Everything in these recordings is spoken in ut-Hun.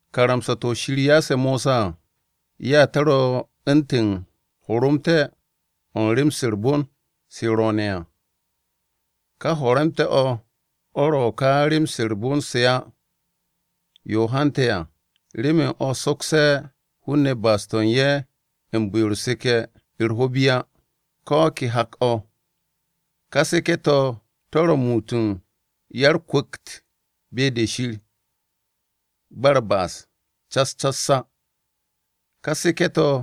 Karamsa-to̱ Shir ya'ase̱ Mosa à, ya to̱ ro̱ u̱ntu̱n horomte̱-o̱ u̱n rem-se u̱r-bon se ro̱o̱ne̱ à. Ká horomte̱-o̱, o̱ ro̱ ka rem-se u̱r-bon se hi u̱n de u̱n se á. Yo hante̱ kaane̱ à, yo ro̱, remen o̱ sokse̱ hun-ne̱ ba'as-to̱ u̱n ye̱ u̱n bu̱-yo u̱r-seke̱ ho̱-u̱r bi ko̱ o̱ ke hak-o̱ á. Ká seke̱-to̱ to̱ ro̱ m-muut u̱n ya-u̱r-kwu̱kt be-de Shir, ba u̱r-ba'as cas cas á. Ká seke̱-to̱,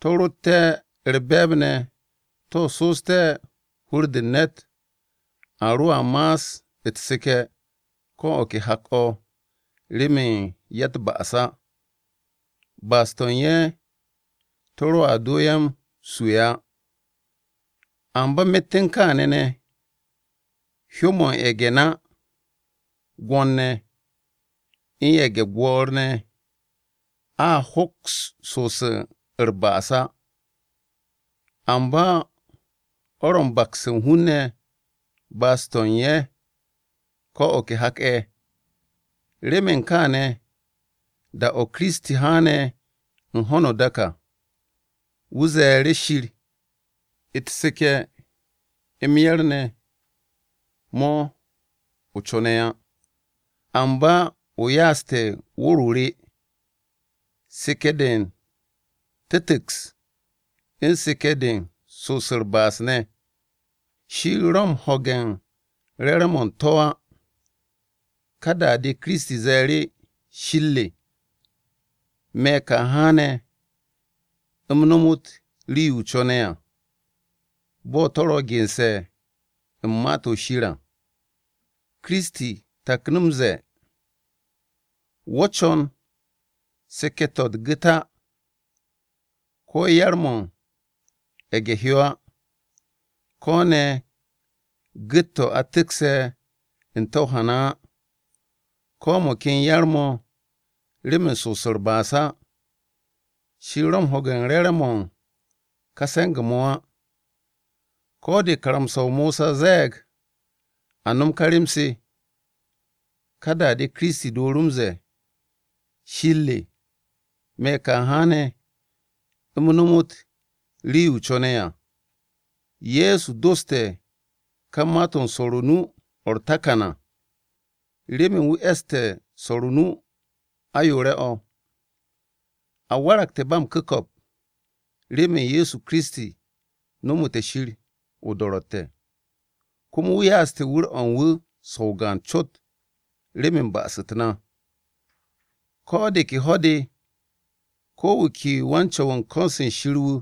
to̱ rotte̱ u̱r-be̱e̱b ne̱ to̱ so'oste̱ hur-de u̱n ne̱t, a roa ma'as u̱t-seke̱ ko̱ o̱ ke hak-o̱, remen ya-u̱t-ba'as á. Ba'as-to̱ u̱n ye̱ to̱ roa do ye̱ m-su̱'e̱ á. Amba myet u̱n kaane̱ ne̱, hyó-mo̱ u̱n ye̱ge̱-gwo̱n-ne̱ gwo̱n-ne̱ ye̱ u̱n na, u̱n ye̱ge̱-gwo̱o̱r ne̱ a hoks so'os u̱r-ba'as á. Amba o̱ ro̱ u̱n bakse̱ u̱n hun-ne̱ ba'as-to̱ u̱n ye̱ ko̱ o̱ ke hak-o̱. Remen kaane̱, da-o̱ Kiristi haane̱ u̱n ho̱no o-dak à, wu̱ ze̱e̱ru̱ Shir, “U̱t-seke̱ m-yar ne̱ mo̱ o co̱ne̱ á, Amba o ya'aste̱ wu̱r-o re. Seke̱-de u̱n tu̱ntu̱ks u̱n seke̱-de u̱n so'os u̱r-ba'as ne̱, Shir ro̱ m-ho̱ge̱ u̱n re̱re̱m-mo̱ u̱n to̱ á. Ka da-de Kiristi ze̱e̱ru̱, ‘Shir re, me̱ ka haane̱ m-nomot rii-yo o co̱ne̱ à, Bo̱ to̱ ro̱ ge̱nse̱ u̱n Ma-to̱ Shir à.’” Kiristi taknu̱ m-ze̱e̱, “Wo̱ co̱n seke̱-to̱ u̱t-gu̱t á, ko̱ yar-mo̱ u̱n ye̱ge̱-hyo á, ko̱ ne̱ gu̱t-to̱ a tu̱kse̱ n-te̱ o-hana á, ko̱ mo̱ ken yar-mo̱ remen so'os u̱t-ba'as á. Shir ro̱ m-ho̱ge̱ u̱n re̱re̱m-mo̱ u̱n ká se̱nge̱-mo̱ á.” (Ko̱ de karamsa-o Mosa zette̱ a no̱m ka rem-se à). Ka da-de Kiristi dooru̱ m-ze̱e̱, “Shir re, me̱ ka haane̱ m-nomot rii-yo o co̱ne̱ à.” Ye̱so doste̱ ka ma-to̱ swo̱r nu-o̱ u̱r-takan o̱, remen wu̱ e̱sté̱ swo̱r o-nu ayoore̱-o̱. A waragte̱ ba m-ku̱ko̱p remen Ye̱so Kiristi nomote̱ Shir o-do̱ro̱tte̱. Komo wu̱ ya'aste̱ wu̱r-o̱ u̱n wu̱ so̱ o-gaan cot, remen ba'as-u̱t na. Ko̱ de ke ho̱-de, ko̱ wu̱ ke wan-Co̱w u̱n ko̱n-se Shir wu̱,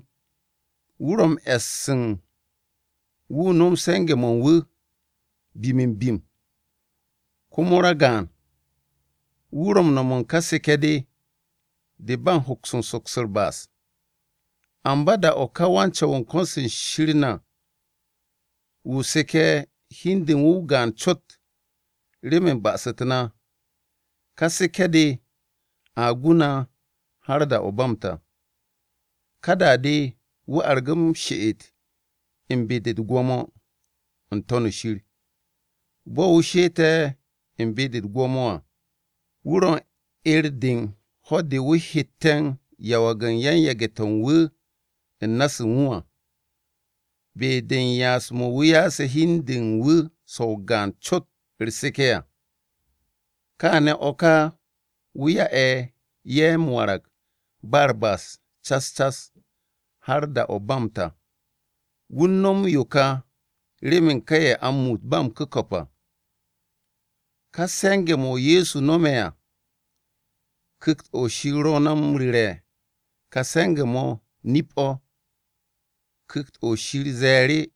wu̱ ro̱ m-e̱s wu̱ nom se̱nge̱-mo̱ u̱n wu̱; bim-m-bim komo ragaan-wu̱ ro̱ u̱n seke̱ u̱n ka seke̱-de de u̱n ba u̱n ho̱ks u̱n soks u̱r-ba'as de. Amba da-o̱ ka wan-Co̱w-wu̱ u̱n ko̱n-se Shir na, wu̱ seke̱ hi u̱n de u̱n wu̱ o-gaan cot remen ba'as-u̱t na à, ká seke̱-de a gu na har da-o̱ ba m-ta. Ka da-de wu̱ argu̱ m-she'et u̱n be-de u̱t-gwo̱mo n-To̱n shir. Bo̱ wu̱ she'ette̱ u̱n be-de u̱t-gwo̱mo à, wu̱ ro̱ u̱n 'er-de u̱n ho̱-de wu̱ hette̱ m-yawag u̱n yan-yage̱-to̱ u̱n wu̱ u̱n na-se u̱n wu̱ à. Be-de u̱n ya'as-mo̱ wu̱ ya'ase̱ hi u̱n de u̱n wu̱ so̱ o-gaan cot u̱r-seke̱ à, kaane̱ o̱ ka wu̱ ya'e̱ ye̱ m-warag ba u̱r-ba'as cas cas, har da-o̱ ba m-ta. Wu̱ u̱n no̱m yo ka remen ka ye̱ a m-muut ba m-ku̱ko̱p à. Ka se̱nge̱-mo̱ Ye̱so no̱me̱ à, Ku̱kt-o̱ Shir ro̱ na m-ru̱re̱ ka se̱nge̱-mo̱ nip-o̱. Ku̱kt-o̱ Shir ze̱e̱ru̱,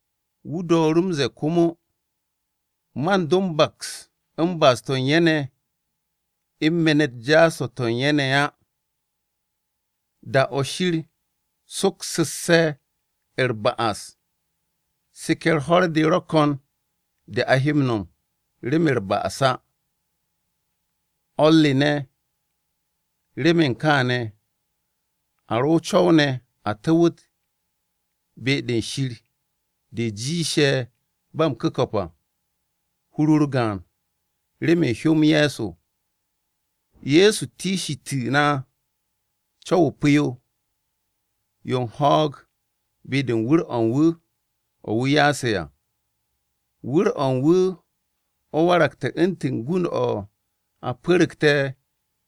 Wu̱ dooru̱ m-ze̱e̱ komo, “Man do m-baks u̱n ba'as-to̱ u̱n ye̱ ne̱, u̱n me̱n-u̱t jaas-to̱ to̱ u̱n ye̱ ne̱ á.” Da-o̱ Shir soksu̱sse̱ u̱t-ba'as, seke̱ u̱r-ho̱r-de ro̱ ko̱n de a he m-no̱m, remen u̱r-ba'as á. O̱r re ne̱, remen kaane̱ a ro̱ o-co̱w ne̱ a tu̱wu̱t “Be-de Shir de jiishe̱ ba m-ku̱ko̱p à” hur-u̱r gaan remen hyó-m Ye̱so. Ye̱so tikshitu̱ na co̱w-o pu̱-yo yo u̱n ho̱o̱g be-de u̱n wu̱r-o̱ u̱n wu̱ o̱ wu̱ ya'ase̱ à. Wu̱r-o̱ u̱n wu̱ o̱ waragte̱ u̱ntu̱n gund-o̱ a pu̱ru̱gte̱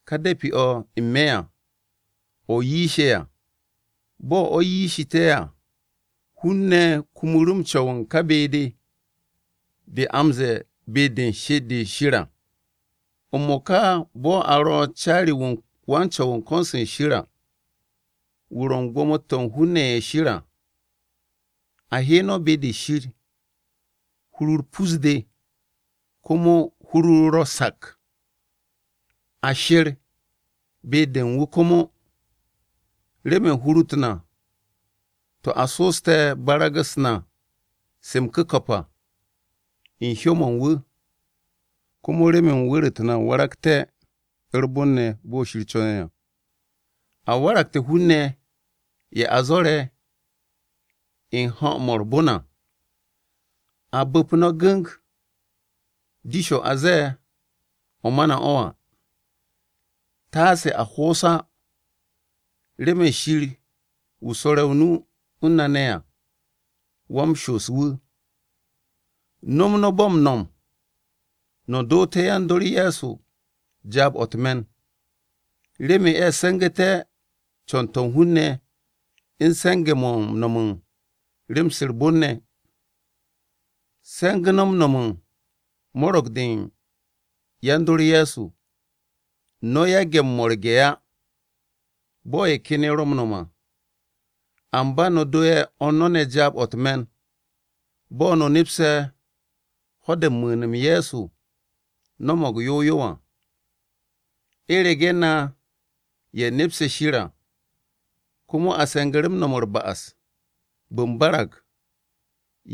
ka de̱pi-o̱ n-me̱ à, o̱ yiishe̱ à. Bo̱ o̱ yiishu̱te̱ à, hun-ne̱ kumu̱ru̱ m-co̱w u̱n ka be-de de a m-ze̱e̱ be-de u̱n she'et-de Shir à. M-mo̱ka bo̱ a ro̱ u̱n caari-wu̱ u̱n wan-Co̱w u̱n ko̱n-se Shir ne̱ à, wu̱ ro̱ u̱n gwo̱mo-to̱ u̱n hun-ne̱ ye̱ Shir à. A he no̱ be-de Shir u̱n hur-u̱r pus-de komo hur-u̱r ro̱ sak. A she̱r be-de u̱n wu̱ komo, remen hur-u̱t na to̱ a so'oste̱ barag-u̱s na se m-ku̱ko̱p, u̱n hyó-mo̱ u̱n wu̱ à. Komo remen wu̱r-u̱t na waragte̱ u̱r-bon ne̱ bo̱ Shir co̱ne̱ à, a waragte̱ hun-ne̱ ye̱ a zo̱re̱ u̱n ho̱-mo̱ u̱r-bon à. A bu̱p no̱ gu̱ng dish-o̱ a ze̱e̱ o̱ ma na o̱ à, taase a ho'os á remen Shir wu̱ swo̱re̱ o-nu u̱n na ne̱ à, wa-m-shoos wu̱. No̱m no̱ bo̱ u̱n no̱m no̱, no̱ doote̱ yan-dor Ye̱so jaab-o̱ u̱t-me̱n, remen ye̱ se̱ngu̱te̱ co̱n-to̱ u̱n hun-ne̱ u̱n se̱nge̱-mo̱ no̱m u̱n rem-se u̱r-bon ne̱. Se̱ngu̱ no̱ m-mo̱rge̱ u̱n mo̱ro̱g-de u̱n yan-dor Ye̱so. No̱ yage̱ m-mo̱rge̱ á, bo̱ ye̱ ken ye̱ ro̱ m-no̱m à. Amba no̱ do ye̱ o̱r no̱ ne̱ jaab-o̱ u̱t-me̱n, bo̱ no̱ nepse̱ ho̱-de u̱n mu̱u̱n-m Ye̱so no̱mo̱g yow yow à. U̱rege̱ na ye̱ nepse̱ o-nip à, komo a se̱ngu̱ru̱ no̱m u̱r-ba'as bu̱nbarag.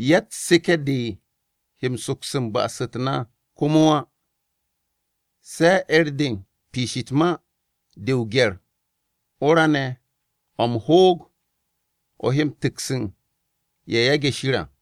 Yatt seke̱-de he soks u̱n ba'as-u̱t na komo á. Se 'er-de u̱n piish u̱t-ma de o-gye̱r o-ra ne̱ o̱ m-hoog o̱ he tu̱ks u̱n ye̱ yage̱ Shir à.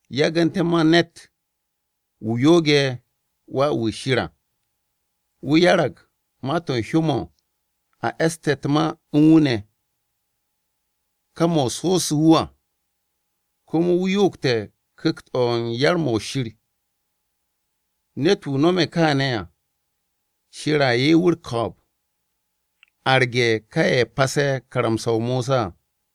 Yagu̱nte̱ ma ne̱t: Wu̱ yo'oge̱ Wà-wu̱ Shir à, Wu̱ 'yarag ma-to̱ u̱n hyó-mo̱ a e̱ste̱ u̱t-ma u̱n wu̱ ne̱, ka mo̱ so'osu̱ wu̱ à, Komo wu̱ yo'ogte̱ Ku̱kt-o̱ m-Yar mo̱ Shir! Ne̱t-wu̱ nome̱ kaane̱ à, Shir a 'ye wu̱ u̱r-ko̱o̱b arge̱ ka ye̱ pase̱ karamsa-o Mosa à.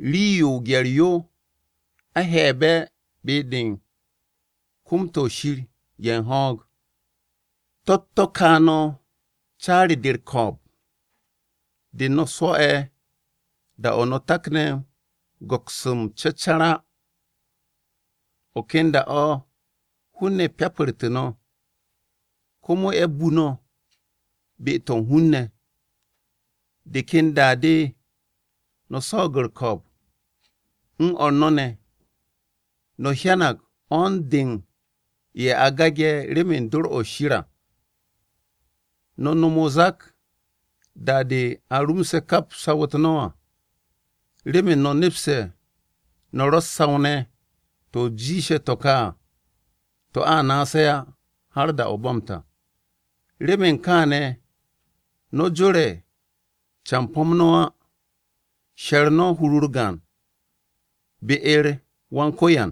Rii-yo o-gye̱r yo a he̱'e̱be̱ be-de u̱n kom-to̱ Shir o̱ u̱n ho̱o̱g. To̱-u̱t to̱ ka no̱ caari-de u̱r-ko̱o̱b de no̱ swo̱'e̱ da-o̱ no̱ takne̱ m-go̱ks m-cecar á. O̱ ken da-o̱ hun-ne̱ pyapartu̱ no̱ komo ye̱ bu no̱ be-to̱ u̱n hun-ne̱, de ken da-de no̱ swo̱o̱g u̱r-ko̱o̱b u̱n o̱r no̱ ne̱. No̱ hyanag 'wo̱n-de u̱n ye̱ a gage̱ remen dor-o̱ Shir à, no̱ nom o-zak da-de a rumse̱ kap saw-u̱t no̱ à, remen no̱ nepste̱ no̱ ro̱ u̱s-saw ne̱ to̱ jiishe̱ to̱ ka à, to̱ a naase̱ á, har da-o̱ ba m-ta. Remen kaane̱, no̱ jore̱ campo-m no̱ á, she̱r no̱ hur-u̱r gaan be-u̱r u̱n Wan-Ko̱yan,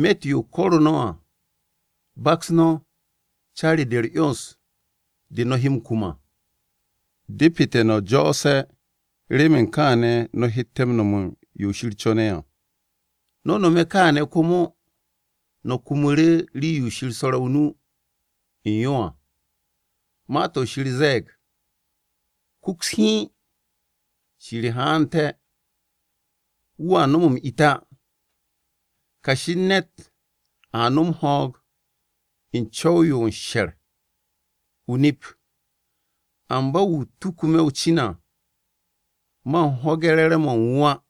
myet yo ko̱ru̱ no̱ à, baks no̱ caari-de u̱r-'yons de no̱ he m-kum à. Depete̱ no̱ jo̱o̱se̱, remen kaane̱ no̱ hette̱ m-no̱m yo Shir co̱ne̱ à. No̱ nome̱ kaane̱ komo no̱ kumu̱ru̱ rii-yo Shir swo̱re̱ o-nu u̱n yo à. Ma-to̱ Shir ze̱e̱g: “Kuks hiin, Shir haante̱. Wu̱a nom m-it á. Kashi u̱n ne̱t a nom ho̱o̱g u̱n co̱w-yo u̱n sher o-nip. Amba wu̱ tuku me̱ o-cin à, man ho̱ge̱ re̱re̱m-mo̱ u̱n wu̱ á.”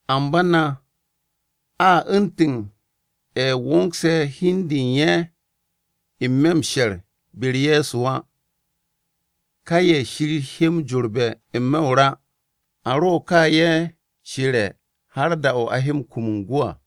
Amba na, a u̱ntu̱n ye̱ wo̱ngse̱ hi-de u̱n ye̱ n-me̱ m-she̱r be-u̱r Ye̱so á. Ka ye̱ Shir he m-jorbe̱ n-me̱ o-ra à. A ro̱ ka ye̱ she̱re̱ har da-o̱ a he kum u̱n gwu̱ à.